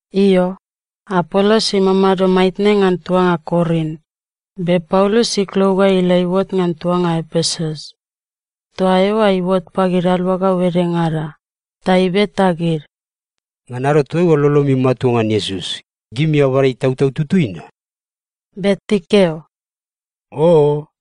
Io, Apolos imamado maitne ngan tuanga Korin, be Paulus iklou ga ila iuot ngan tuanga Epesus. Toa eoa iuot pagid aluagau edengada. Ta ibeta gid, “Ngan ado toaiua lolomi matua ngan Iesus, gimi abada Itautau Tutui na?” Be tikeo, “Oo.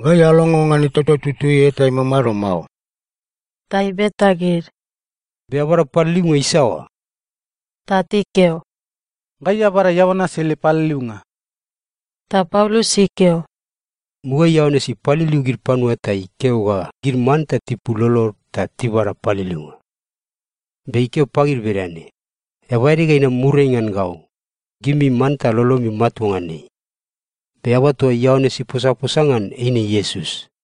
Gai alongo ngan Itautau Tutui eta imamado mao.” Ta ibeta gid, “Be abada paliliunga isaoa?” Ta tikeo, “Gai abada Ioanes ele paliliunga.” Ta Paulus ikeo, “Mugaeai Ioanes ipaliliu gid panua ta ikeo ga gid manta tipul lolod ta tibada paliliunga. Be ikeo pagid bedane, ‘Eaba ede ga inam muriai ngan gau, gimi manta lolomi matua ngan ei.’ Be eaba toa Ioanes iposaposa ngan eine Iesus.”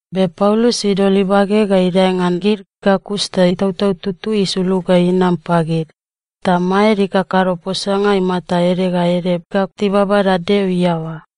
Be Paulus idol ibage ga idae ngan gid ga kus ta Itautau Tutui isulug ga inam pagid, ta maed ikakado posanga imata ede ga ede ga tibabada Deo iaoa.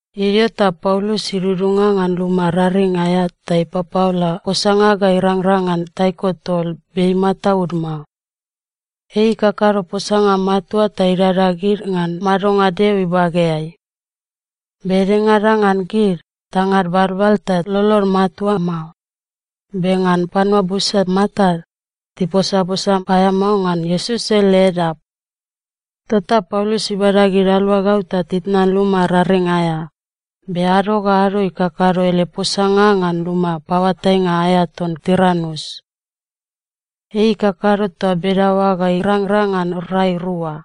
Idio ta Paulus idudunga ngan luma raring aea ta ipapaola posanga ga irangrang ngan taiko tol be imataud mao. Ei ikakado posanga matua ta idada gid ngan madonga Deo ibageai. Be edengada ngan gid, tangad balbal ta lolod matua mao, be ngan panua busa matad, tiposaposa paeamao ngan Iesus ele Edap. Tota Paulus ibada gid aluagau ta titnan luma raring aea, be ado ga ado ikakado ele posanga ngan luma paoatainga aea ton Tiranus. Ei ikakado toa bedaoa ga irangrang ngan rai rua.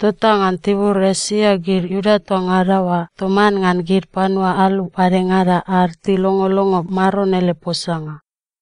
Tota ngan tibur Esia gid Iuda toa ngada oa toman ngan gid panua alu padengada ad tilongolongo Maron ele posanga.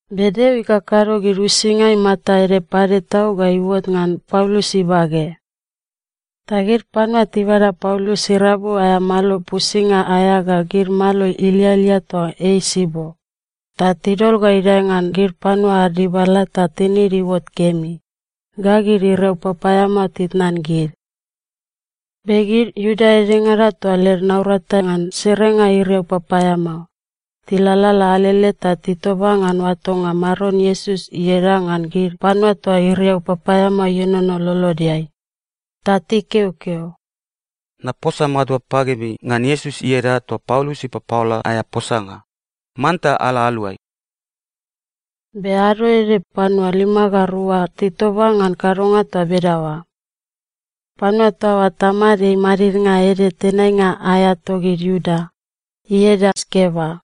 Be Deo ikakado gid uisinga imata ede pade tau ga iuot ngan Paulus ibage. Ta gid panua tibada Paulus irabu aea malo pusinga aea ga gid malo ilialia toa ei sibo, ta tidol ga idae ngan gid panua ad dibala ta tinid iuot kemi, ga gid iriau papaeamao titnan gid. Be gid Iuda edengada toa led naurata ngan serenga iriau papaeamao, tilalala alele ta titoba ngan oatonga Maron Iesus ieda ngan gid panua toa iriau papaeamao ienono lolodeai. Ta tikeokeo, “Naposa matua pagimi ngan Iesus ieda toa Paulus ipapaola aea posanga, manta ala aluai!” Be ado ede panua lima ga rua titoba ngan kadonga toa bedaoa. Panua toa oa tamad ei madidnga ede tenainga aea togid Iuda, ieda Skeva.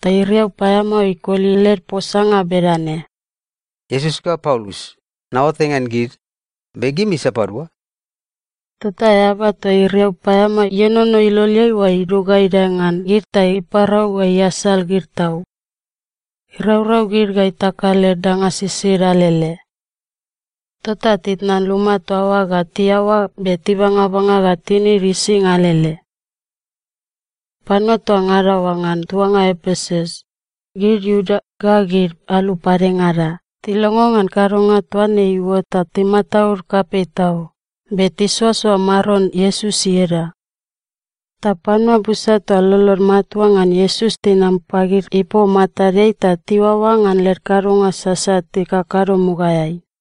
Ta iriau paeamao ikoli led posanga bedane, “Iesus ga Paulus, naoatai ngan gid, be gimi sapadua?” Tota eaba toa iriau paeamao ienono iloleai oa idug ga idae ngan gid ta iparau ga iasal gid tau. Iraurau gid ga itaka led danga sisid alele. Tota titnan luma toa oa ga tiaoa be tibangabanga ga tinid ising alele. Panua toa ngada oa ngan tuanga Epesus, gid Iuda ga gid alu padengada, tilongo ngan kadonga toa ne iuot ta timataud kapei tau, be tisoasoa Maron Iesus ieda. Ta panua busa toa lolod matua ngan Iesus tinam pagid ipom matadeai ta tiuaoa ngan led kadonga sasat tikakado mugaeai.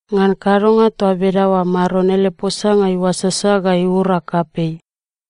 Ngan kadonga toa bedaoa Maron ele posanga iuasasa ga iura kapei.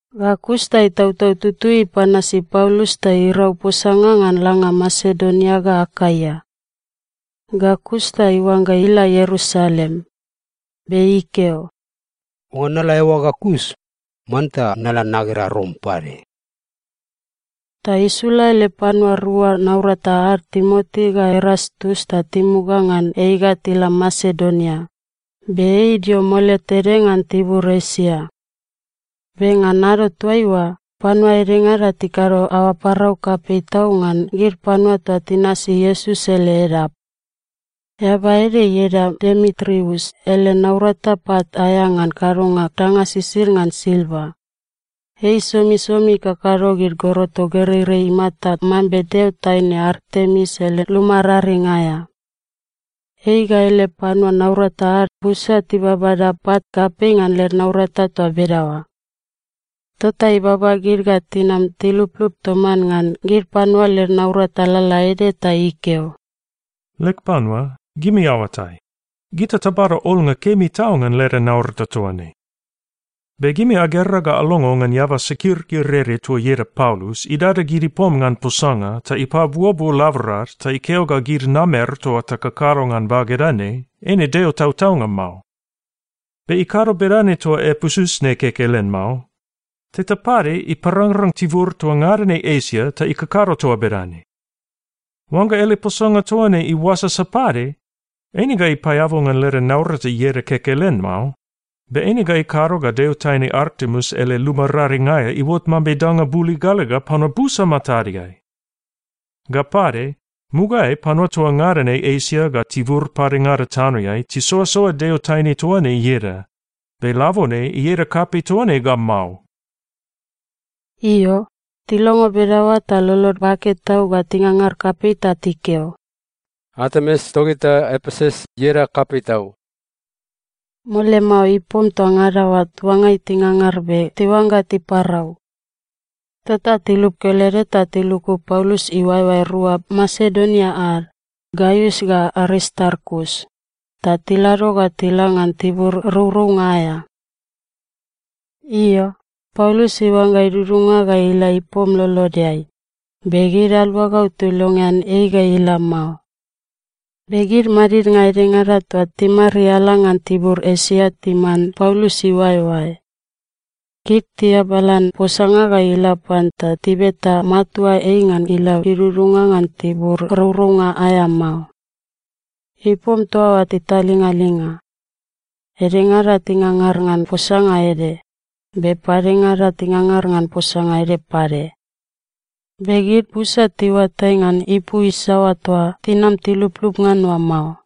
Ga kus ta Itautau Tutui ipanasi Paulus ta irau posanga ngan langa Masedonia ga Akaia. Ga kus ta iuangga ila Ierusalem. Be ikeo, “Oangga nala eoa ga kus, manta nala nagera Rom pade.” Ta isula ele panua rua naurata ad Timoti ga Erastus ta timuga ngan ei ga tila Masedonia, be ei idio mole tede ngan tibur Esia. Be ngan ado toaiua, panua edengada tikado aoa parau kapei tau ngan gid panua toa tinasi Iesus ele Edap. Eaba ede ieda Demitrius ele naurata pat aea ngan kadonga danga sisid ngan silva. Ei somisomi ikakado gid goroto gereirei imata mambe deo taine Artemis ele luma raring aea. Ei ga ele panua naurata ad busa tibabada pat kapei ngan led naurata toa bedaoa. Tota ibaba gid ga tinam tiluplup toman ngan gid panua led naurata lalaede ta ikeo, “Leg panua, gimi aoatai, gita tabada olnga kemi tau ngan leda naurata toa ne. Be gimi agera ga alongo ngan eaba sakirkir ede toa ieda Paulus idada gid ipom ngan posanga ta ipabuobuo laborad ta ikeo ga gid namer toa takakado ngan bageda ne eine deo tautaunga mao. Be ikado bedane toa Epesus ne kekelen mao. Teta pade iparangrang tibur toa ngada ne Esia ta ikakado toa bedane! Oangga ele posanga toa ne iuasasa pade, eine ga ipaeabu ngan leda naurata ieda kekelen mao, be eine ga ikado ga deo taine Artemis ele luma raring aea iuot mambe danga buligaliga panua busa matadeai! Ga pade, mugaeai panua toa ngada ne Esia ga tibur padengada tanoeai tisoasoa deo taine toa ne ieda, be labone ieda kapei toa ne ga mao.” Io, tilongo bedaoa ta lolod bake tau ga tingangar kapei ta tikeo, “Artemis togita Epesus, ieda kapei tau!” Mole mao ipom toa ngada oa tuangai tingangar be tiuangga tiparau. Tota tilup kelede ta tiluku Paulus iuaeoae rua Masedonia ad, Gaius ga Aristarkus, ta tilado ga tila ngan tibur rourounga aea. Io, Paulus iuangga idudunga ga ila ipom lolodeai, be gid aluagau tilongean ei ga ila mao. Be gid madidnga edengada toa timariala ngan tibur Esia timan Paulus iuaeoae. Gid tiabalan posanga ga ila pan ta tibeta matua ei ngan ila idudunga ngan tibur rourounga aea mao. Ipom toa oa titalingalinga. Edengada tingangar ngan posanga ede, be padengada tingangar ngan posanga ede pade. Be gid busa tiuatai ngan ipu isaoa toa tinam tiluplup ngan oa mao.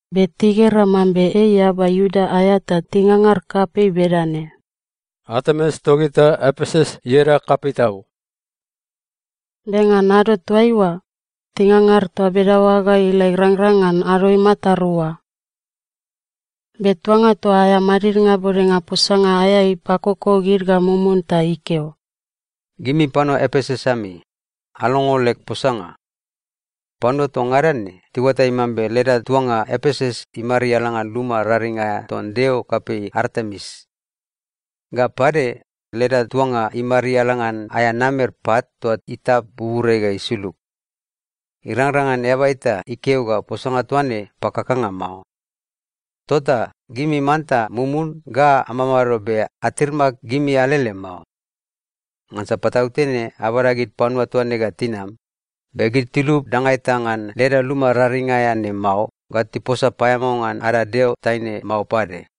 Be tigera mambe ei eaba Iuda aea ta tingangar kapei bedane, “Artemis togita Epesus, ieda kapei tau!” Be ngan ado toaiua, tingangar toa bedaoa ga ila irangrang ngan ado imata rua. Be tuanga toa aea madidnga bodenga posanga aea ipakoko gid ga mumun ta ikeo, “Gimi panua Epesus ami, alongo leg posanga. Panua toa ngada ne tiuatai mambe leda tuanga Epesus imariala ngan luma raring aea ton deo kapei Artemis. Ga pade, leda tuanga imariala ngan aea namer pat toa itap buburiai ga isulug. Irangrang ngan eaba eta ikeo ga posanga toa ne pakakanga mao. Tota gimi manta mumun ga amamado be atirmak gimi alele mao. Ngansa patautene abada gid panua toa ne ga tinam, be gid tilub danga eta ngan leda luma raring aea ne mao ga tiposa paeamao ngan ada deo taine mao pade.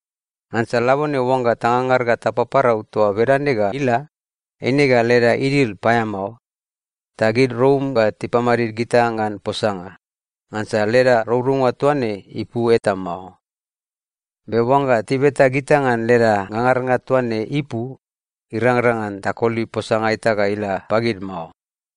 Ngansa labone oangga tangangar ga tapaparau toa bedane ga ila, eine ga leda idil paeamao, ta gid Rom ga tipamadid gita ngan posanga, ngansa leda rourounga toa ne ipu eta mao. Be oangga tibeta gita ngan leda ngangarnga toa ne ipu, irangrang ngan takoli posanga eta ga ila pagid mao.”